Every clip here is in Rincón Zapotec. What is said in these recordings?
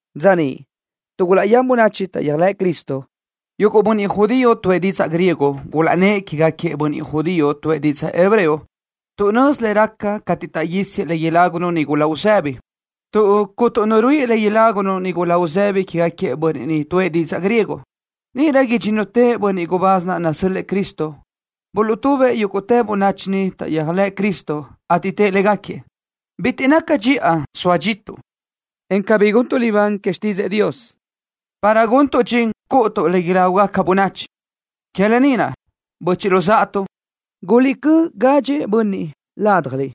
Dza niʼ, tuʼ gulaʼyán bönachi taʼyéajlëʼ Cristo, yuguʼ bönniʼ judío tuʼë didzaʼ griego gulaʼnnë́ʼ quégaquiëʼ bönniʼ judío tuʼë didzaʼ hebreo tuʼ nözi le raca cateʼ taʼguísiëʼ le ilágunu nigula uzëbi, tuʼ cuntu nu ruíʼi le ilágunu nigula uzëbi quégaquiëʼ bönniʼ niʼ tuʼë didzaʼ griego. Níʼirö idxínnutëʼ bönniʼ gubáz naʼ nasö́l-lëʼë Cristo buluʼtubëʼ yúguʼtë bönachi niʼ taʼyéajlëʼ Cristo, ateʼ tëʼ légaquiëʼ: —Bitiʼ naca dxiʼa soa dxituʼ, en cabí guntuʼ libán que xtídzëʼë Dios, para guntuʼ dxin cúʼutuʼ le ilágugaca bönachi. Que lë ni naʼ, böchiʼ luzáʼatuʼ, guliʼcö́ gadxëʼ bönniʼ ládjaliʼ,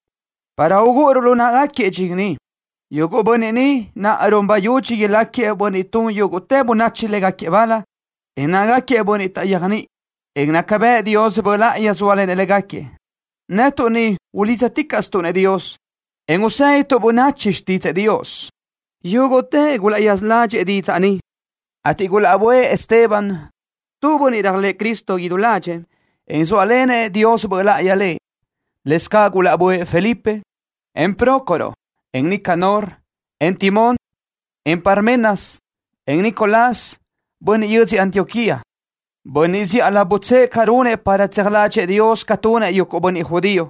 para ugúʼuruʼ lu náʼagaquiëʼ dxin ni. Yuguʼ bönniʼ naʼ run bayudxi ilácagaquiëʼ bönniʼ tun yúguʼtë bönachi légaquiëʼ bal, en nácagaquiëʼ bönniʼ taʼyéajniʼi, en naca bëʼ Dios Böʼ Láʼayi zóalenëʼ légaquiëʼ. Netuʼ ni ulídzaticaʼstuʼ-nëʼ Dios, en usédituʼ bönachi xtídzëʼë Dios. Yúguʼtëʼ gulaʼyaza ládxiʼgaquiëʼ didzaʼ ni, ateʼ gulaʼbö́ëʼ Esteban, tu bönniʼ réajlëʼë Cristo idú ládxëʼë, en zóalenëʼ Dios Böʼ Láʼayi lëʼ. Lëscaʼ gulaʼbö́ëʼ Felipe, en Prócoro, en Nicanor, en Timón, en Parmenas, en Nicolás, bönniʼ yödzö Antioquía, bönniʼ zíʼalö butsë́ʼë ca runëʼ para tseaj ládxëʼë Dios ca tunëʼ yuguʼ bönniʼ judío.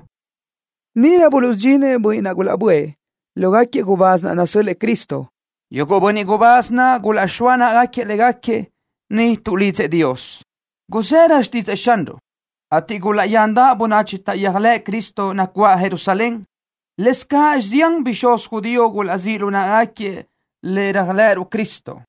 Níʼirö buluʼsudxinëʼ bönniʼ naʼ gulaʼbö́ëʼ lógaquiëʼ gubáz naʼ nasö́l-lëʼë Cristo. Yuguʼ bönniʼ gubáz naʼ gulaʼxóa náʼagaquiëʼ légaquiëʼ, niʼ tuʼlidzëʼ Dios. Guzërö xtídzëʼë Xanruʼ, ateʼ gulaʼyandaʼ bönachi taʼyéajlëʼ Cristo nacuáʼ Jerusalén. Lëscaʼ zián bixúz judío gulaʼzíʼ lu náʼagaquiëʼ le réajlëʼëruʼ Cristo.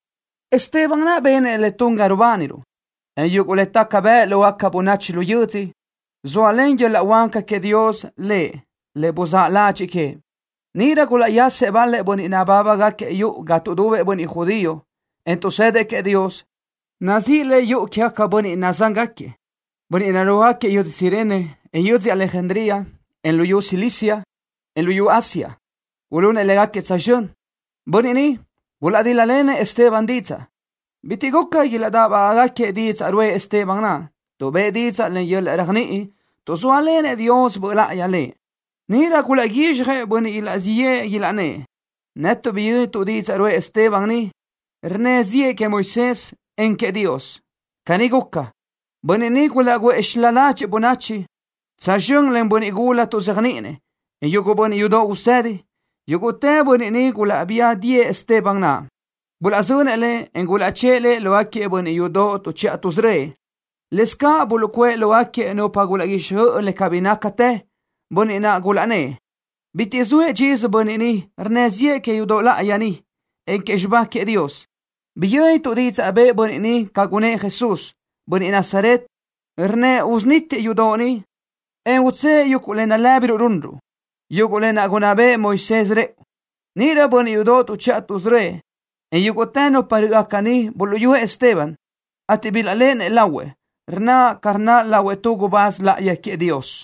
Esteban naʼ benëʼ le tun ga rubániruʼ, en yuguʼ le taca bëʼ lógaca bönachi lu yödzö, zóalen yöl-laʼ huáca queëʼ Dios lëʼ le buzáʼ ládxëʼë queëʼ. Níʼirö gulaʼyasëʼ bal-lëʼ bönniʼ nabábagaquiëʼ yuʼu ga tuʼdubëʼ bönniʼ judío, en tuʼsëdëʼ queëʼ Dios, nazíʼi le Yuʼu Quégaquiëʼ Bönniʼ Nadzángaquiëʼ. Bönniʼ narúajgaquiëʼ yödzö Cirene, en yödzö Alejandría, en luyú Cilicia, en luyú Asia, gulunëʼ légaquiëʼ tsözxö́n. Bönniʼ ni gulaʼdíl-lalenëʼ Esteban didzaʼ. Bitiʼ guca táʼbagaʼgaquiëʼ didzaʼ ruʼë Esteban naʼ, tuʼ bëʼë didzaʼ len yöl-laʼ réajniʼi, tuʼ zóalenëʼ Dios Böʼ Láʼayi lëʼ. Níʼirö gulaʼguízxjëʼ bönniʼ ilaʼzíʼ yëʼë, ilaʼnnë́ʼ: “Netuʼ biyö́nituʼ didzaʼ ruʼë Esteban ni, rnnë ziʼë queëʼ Moisés, en queëʼ Dios.” Caní guca, bönniʼ ni gulaʼguʼë xilá ládxiʼgaca bönachi, tsözxö́n len bönniʼ gula tuʼzéajniʼinëʼ, en yuguʼ bönniʼ yudoʼ usëdi. Yúguʼtë bönniʼ ni gulaʼbía diʼë Esteban naʼ. Gulaʼzönëʼ lëʼ, en gulaʼchë́ʼë lëʼ lógaquiëʼ bönniʼ yudoʼ tuʼchiʼa tuʼsörö́ëʼ. Lëscaʼ buluʼcuʼë lógaquiëʼ nupa gulaʼguíxjöʼ le cabí nácatë, bönniʼ naʼ gulaʼnnë́ʼ: —Bitiʼ zoëʼ dxisö bönniʼ ni rnnë ziʼë que yudoʼ láʼayi ni, en que xibá queëʼ Dios. Biyö́nituʼ didzaʼ bëʼë bönniʼ ni ca gunëʼ Jesús, bönniʼ Nazaret, rnnëʼ usunítiëʼ yudoʼ ni, en utsë́ʼë yuguʼ le nalë́biruʼ runruʼ, yuguʼ lë naʼ gunná béʼenëʼ Moisés rëʼu. Níʼirö bönniʼ yudoʼ tuʼchiʼa tuʼsörö́ëʼ, en yúguʼtë nupa rö́ʼgaca niʼ buluʼyúëʼ Esteban, ateʼ bilaʼléʼenëʼ lahuëʼ, rnaʼ ca rnaʼ lahuëʼ tu gubáz láʼayi queëʼ Dios.